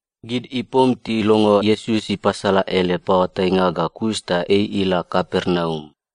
Gid ipom tilongo Iesus ipasala ele paoatainga ga kus ta ei ila Kapernaum.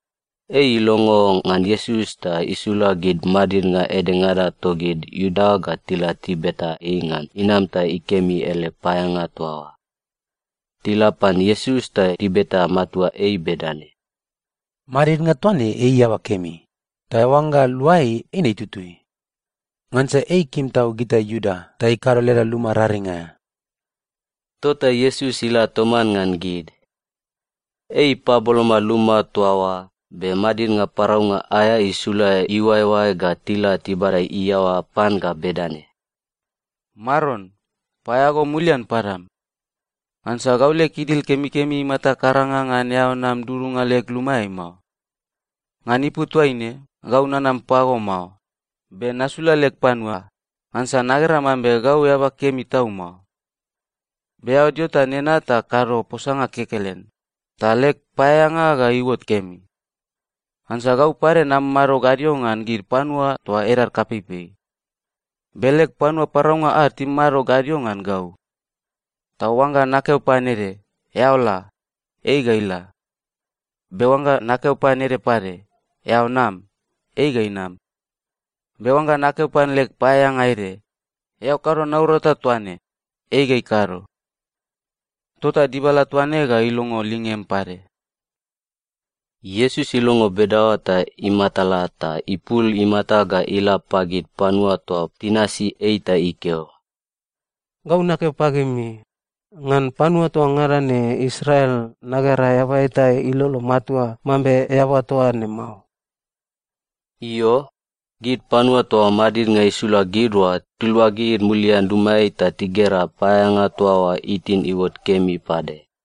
Ei ilongo ngan Iesus ta isula gid madidnga edengada togid Iuda ga tila tibeta ei ngan inam ta ikemi ele paeaeanga toa oa. Tila pan Iesus ta tibeta matua ei bedane, “Madidnga toa ne ei eaba kemi, ta oangga eao lua ei, eine tutui. Ngansa ei ikim tau gita Iuda ta ikado leda luma raring aea.” Tota Iesus ila toman ngan gid. Ei ipaboloma luma toa oa, be madidnga paraunga aea isula iuaeoae ga tila tibada iaoa pan ga bedane, “Maron, paeaea go mulian padam. Ngansa gau leg idil kemikemi imata karanga ngan eao nam dudunga leg lumaeai mao. Ngan ipu toaine, gau nanam pago mao, be nasula leg panua, ngansa nagera mambe gau eaba kemi tau mao. Be eao dio toa nena ta kado posanga kekelen, ta leg paeaeanga ga iuot kemi. Ngansa gau pade namamado gadio ngan gid panua toa edad kapeipei. Be leg panua paraunga ad timamado gadio ngan gau. Ta oangga nakeo pan ede, ‘Eao la,’ ei ga ila. Be oangga nakeo pan ede pade, ‘Eao nam,’ ei ga inam. Be oangga nakeo pan leg paeaeanga ede, ‘Eao kado naurata toa ne,’ ei ga ikado. Tota dibala toa ne ga ilongo lingem pade.” Iesus ilongo bedaoa ta imatala ta ipul imata ga ila pagid panua toa tinasi ei ta ikeo, “Gau nakeo pagimi, ngan panua toa ngada ne Israel nagera eaba eta ilolo matua mambe eaba toa ne mao.” Io, gid panua toa madidnga isula gid oa tiluagid mulian lumaeai ta tigera paeaeanga toa oa itin iuot kemi pade.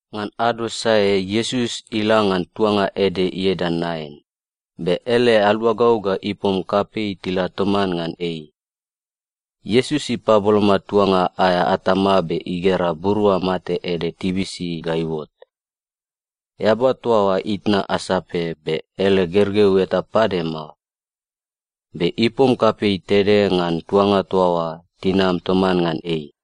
Ngan ado sae Iesus ila ngan tuanga ede ieda Nain, be ele aluagau ga ipom kapei tila toman ngan ei. Iesus ipaboloma tuanga aea atama be igera burua mate ede tibisi ga iuot. Eaba toa oa itna asape be ele gergeu eta pade mao. Be ipom kapei tede ngan tuanga toa oa tinam toman ngan ei.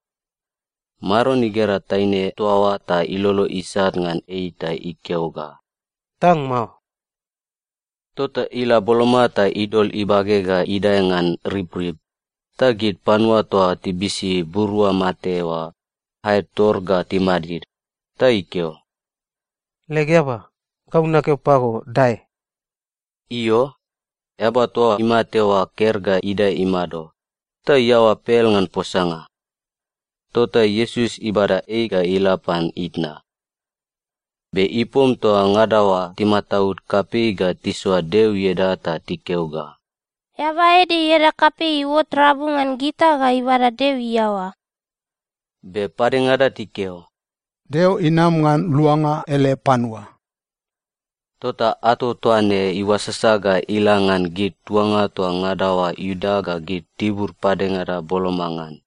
Maron igera taine toa oa ta ilolo isat ngan ei ta ikeo ga, “Tang mao.” Tota ila boloma ta idol ibage ga idae ngan ribrib, ta gid panua toa tibisi burua mate oa aed tor ga timadid. Ta ikeo, “Leg eaba, gau nakeo pago, dae!” Io, eaba toa imate oa ker ga idae imado, ta iaoa pel ngan posanga. Tota Iesus ibada ei ga ila pan itna. Be ipom toa ngada oa timataud kapei ga tisoa Deo ieda ta tikeo ga, “Eaba ede ieda kapei iuot rabu ngan gita ga ibada Deo iaoa.” Be padengada tikeo, “Deo inam ngan luanga ele panua.” Tota ato toa ne iuasasa ga ila ngan gid tuanga toa ngada oa Iudea ga gid tibur padengada boloma ngan.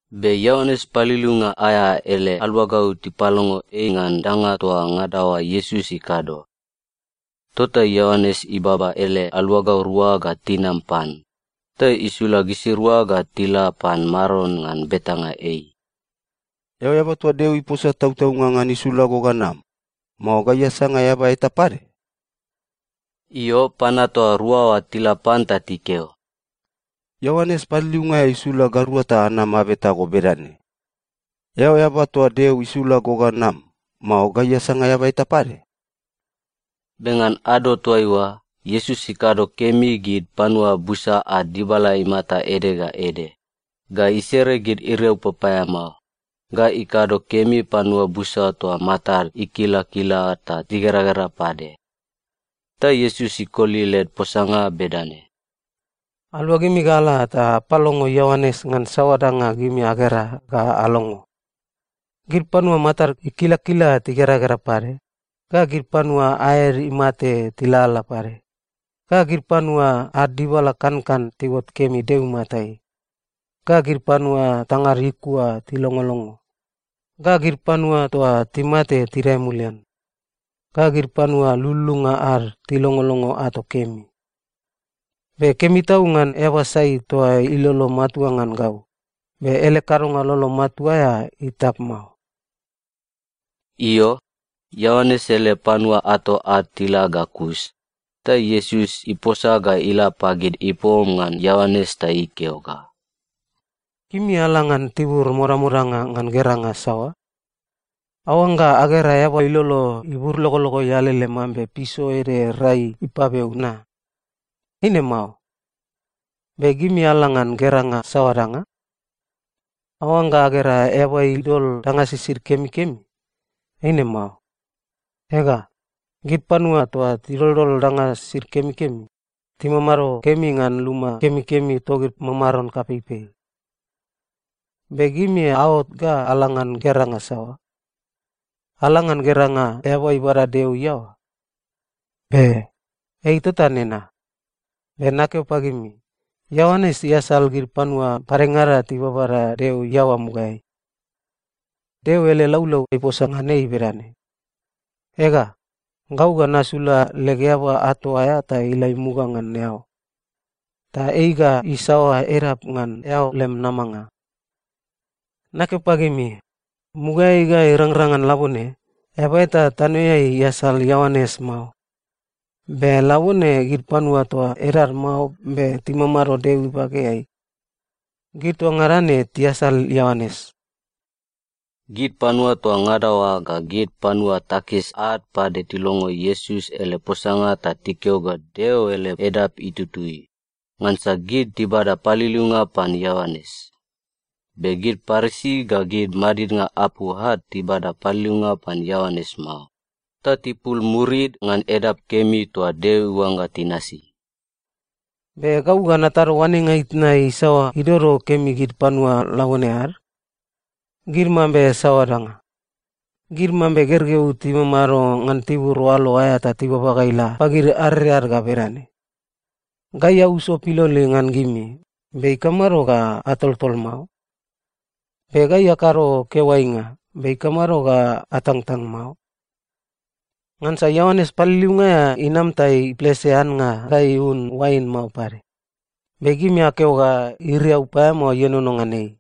Be Ioanes Paliliunga aea ele aluagau tipalongo ei ngan danga toa ngada oa Iesus ikado. Tota Ioanes ibaba ele aluagau rua ga tinam pan, ta isula gisirua ga tila pan Maron ngan betanga ei, “Eao eaba toa Deo iposa tautaunga ngan isula go ga nam, mao gai asanga eaba eta pade?” Io, panua toa rua oa tila pan ta tikeo, “Ioanes Paliliunga aea isula gairua ta anam abeta go bedane: Eao eaba toa Deo isula go ga nam, mao gai asanga eaba eta pade?” Be ngan ado toaiua, Iesus ikado kemi gid panua busa ad dibala imata ede ga ede, ga isere gid iriau papaeamao, ga ikado kemi panua busa toa matad ikilakila ta tigeragera pade. Ta Iesus ikoli led posanga bedane, “Aluagimi ga ala ta apalongo Ioanes ngan saoa danga gimi agera ga alongo. Gid panua matad ikilakila tigeragera pade, ga gid panua aed imate tilalala pade, ga gid panua ad dibala kankan tiuot kemi Deo imatai, ga gid panua tangad ikua tilongolongo, ga gid panua toa timate tidae mulian, ga gid panua lululunga ad tilongolongo ato kemi. Be kemi tau ngan eaba sai toa ilolo matua ngan gau, be ele kadonga lolo matua aea itap mao.” Io, Ioanes ele panua ato ad tila ga kus, ta Iesus iposa ga ila pagid ipom ngan Ioanes ta ikeo ga, “Gimi ala ngan tibur modamodanga ngan geranga saoa? Aoangga agera eaba ilolo iburlogologoi alele mambe piso ede rai ipabeu na? Eine mao. Be gimi ala ngan geranga saoa danga? Aoangga agera eaba idol danga sisid kemikemi? Eine mao. Ega, gid panua toa tidoldol danga sisid kemikemi, timamado kemi ngan luma kemikemi togid mamaron kapeipei. Be gimi aot ga ala ngan geranga saoa? Ala ngan geranga eaba ibada Deo iaoa? Be! Ei tota nena. Be nakeo pagimi, Ioanes iasal gid panua padengada tibabada Deo iaoa mugaeai. Deo ele laulau iposa ngan ei bedane, “‘Ega, gau ga nasula leg eaba ato aea ta ila imuga ngan eao. Ta ei ga isaoa edap ngan eao lem namanga.’ Nakeo pagimi, mugaeai ga irangrang ngan labone, eaba eta tanoeai iasal Ioanes mao, be labone gid panua toa edad mao be timamado Deo ibageai, gid toa ngada ne tiasal Ioanes.” (Gid panua toa ngada oa ga gid panua takis ad pade tilongo Iesus ele posanga ta tikeo ga Deo ele edap itutui, ngansa gid tibada paliliunga pan Ioanes. Be gid Parisi ga gid madidnga apu ad tibada paliliunga pan Ioanes mao, ta tipul murid ngan edap kemi toa Deo iuangga tinasi.) “Be gau ga natado oanenga itna isaoa idodo kemi gid panua labone ad? Gid mambe saoa danga? Gid mambe gergeu timamado ngan tibur oalo aea ta tibaba ga ila pagid areread ga bedane, “‘Gai auso piloli ngan gimi, be ikamado ga atoltol mao? Be gai akado keoainga, be ikamado ga atangtang mao?’ Ngansa Ioanes Paliliunga aea inam ta iplese annga ga iun oain mao pade, be gimi akeo ga iriau paeamao ienono ngan ei.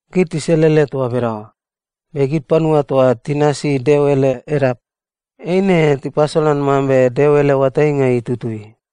Gid tiselele toa bedaoa, be gid panua toa tinasi Deo ele edap, eine tipasolan mambe Deo ele oatainga itutui.”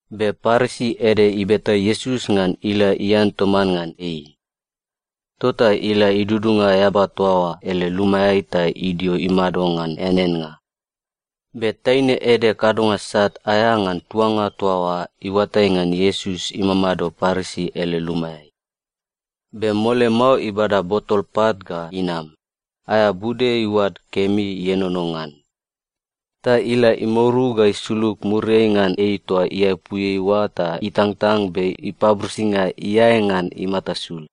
Be Parisi ede ibeta Iesus ngan ila ian toman ngan ei. Tota ila idudunga eaba toa oa ele lumaeai ta idio imado ngan eaneannga. Be taine ede kadonga sat aea ngan tuanga toa oa iuatai ngan Iesus imamado Parisi ele lumaeai. Be mole mao ibada botol pat ga inam, aea bude iuad kemi ienono ngan. Ta ila imouru ga isulug muriai ngan ei toa iaepuiai oa ta itangtang be ipaburisinga iae ngan imata sul.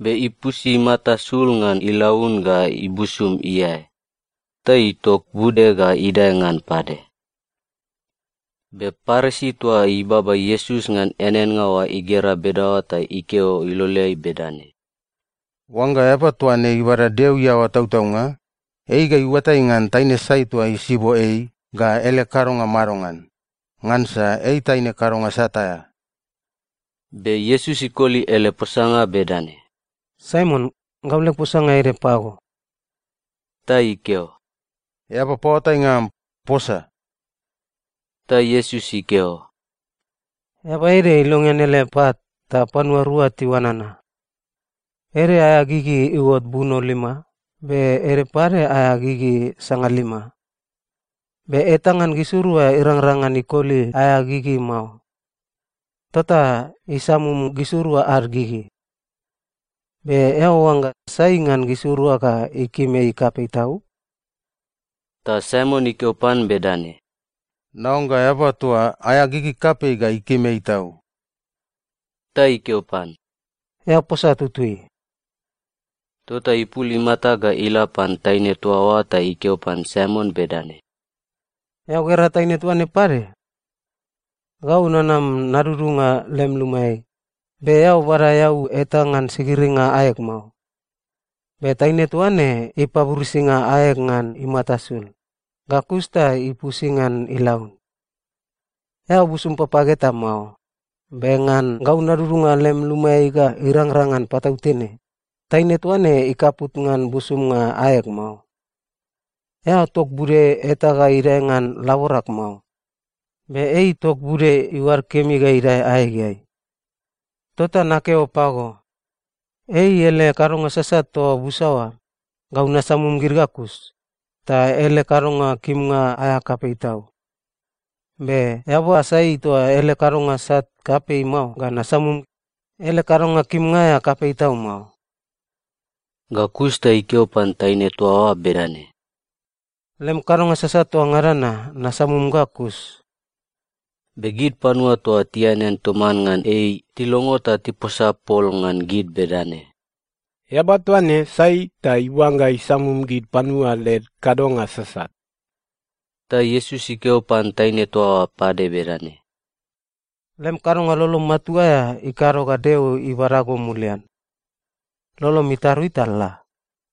Be ipusi imata sul ngan ilaun ga ibusum iae. Ta itok bude ga idae ngan pade. Be Parisi toa ibaba Iesus ngan eaneannga oa igera bedaoa ta ikeo iloleai bedane, “Oangga eaba toa ne ibada Deo iaoa tautaunga, ei ga iuatai ngan taine sai toa isibo ei, ga ele kadonga madongan, ngansa ei taine kadonga sat aea.” Be Iesus ikoli ele posanga bedane, “Saimon, gau leg posanga ede pago.” Ta ikeo, “Eaba paoatainga am, posa.” Ta Iesus ikeo, “Eaba ede ilongean ele pat, ta panua rua tiuanana. Ede aea gigi iuot buno lima, be ede pade aea gigi sangalima. Be eta ngan gisirua irangrang ngan ikoli aea gigi mao. Tota isamum gisirua ad gigi. Be eao oangga sai ngan gisirua ga ikim ei kapei tau?” Ta Saimon ikeo pan bedane, “Naoangga eaba toa aea gigi kapei ga ikim ei tau.” Ta ikeo pan, “Eao posa tutui.” Tota ipul imata ga ila pan taine toa oa ta ikeo pan Saimon bedane, “Eao gera taine toa ne pade? Gau nanam nadudunga lem lumaeai, be eao bada eau eta ngan sigiringa aeg mao. Be taine toa ne ipaburisinga aeg ngan imata sul, ga kus ta ipusi ngan ilaun. Eao busum papag eta mao. Be ngan gau nadudunga lem lumaeai ga irangrang ngan patautene, taine toa ne ikaput ngan busumnga aeg mao. Eao tok bude eta ga idae ngan laborag mao. Be ei itok bude iuad kemi ga idae aegeai. Tota nakeo pago, ei ele kadonga sasat toa busa oa, gau nasamum gid ga kus, ta ele kadonga kimnga aea kapei tau. Be eaba sai toa ele kadonga sat kapei mao ga nasamum, ele kadonga kimnga aea kapei tau mao.” Ga kus ta ikeo pan taine toa oa bedane, “Lem kadonga sasat toa ngada na, nasamum ga kus.” Be gid panua toa tianean toman ngan ei tilongo ta tiposa pol ngan gid bedane, “Eaba toa ne sai ta iuangga isamum gid panua led kadonga sasat?” Ta Iesus ikeo pan taine toa oa pade bedane, “Lem kadonga lolo matua aea ikado ga Deo ibada go mulian. Lolom itarui ta la.”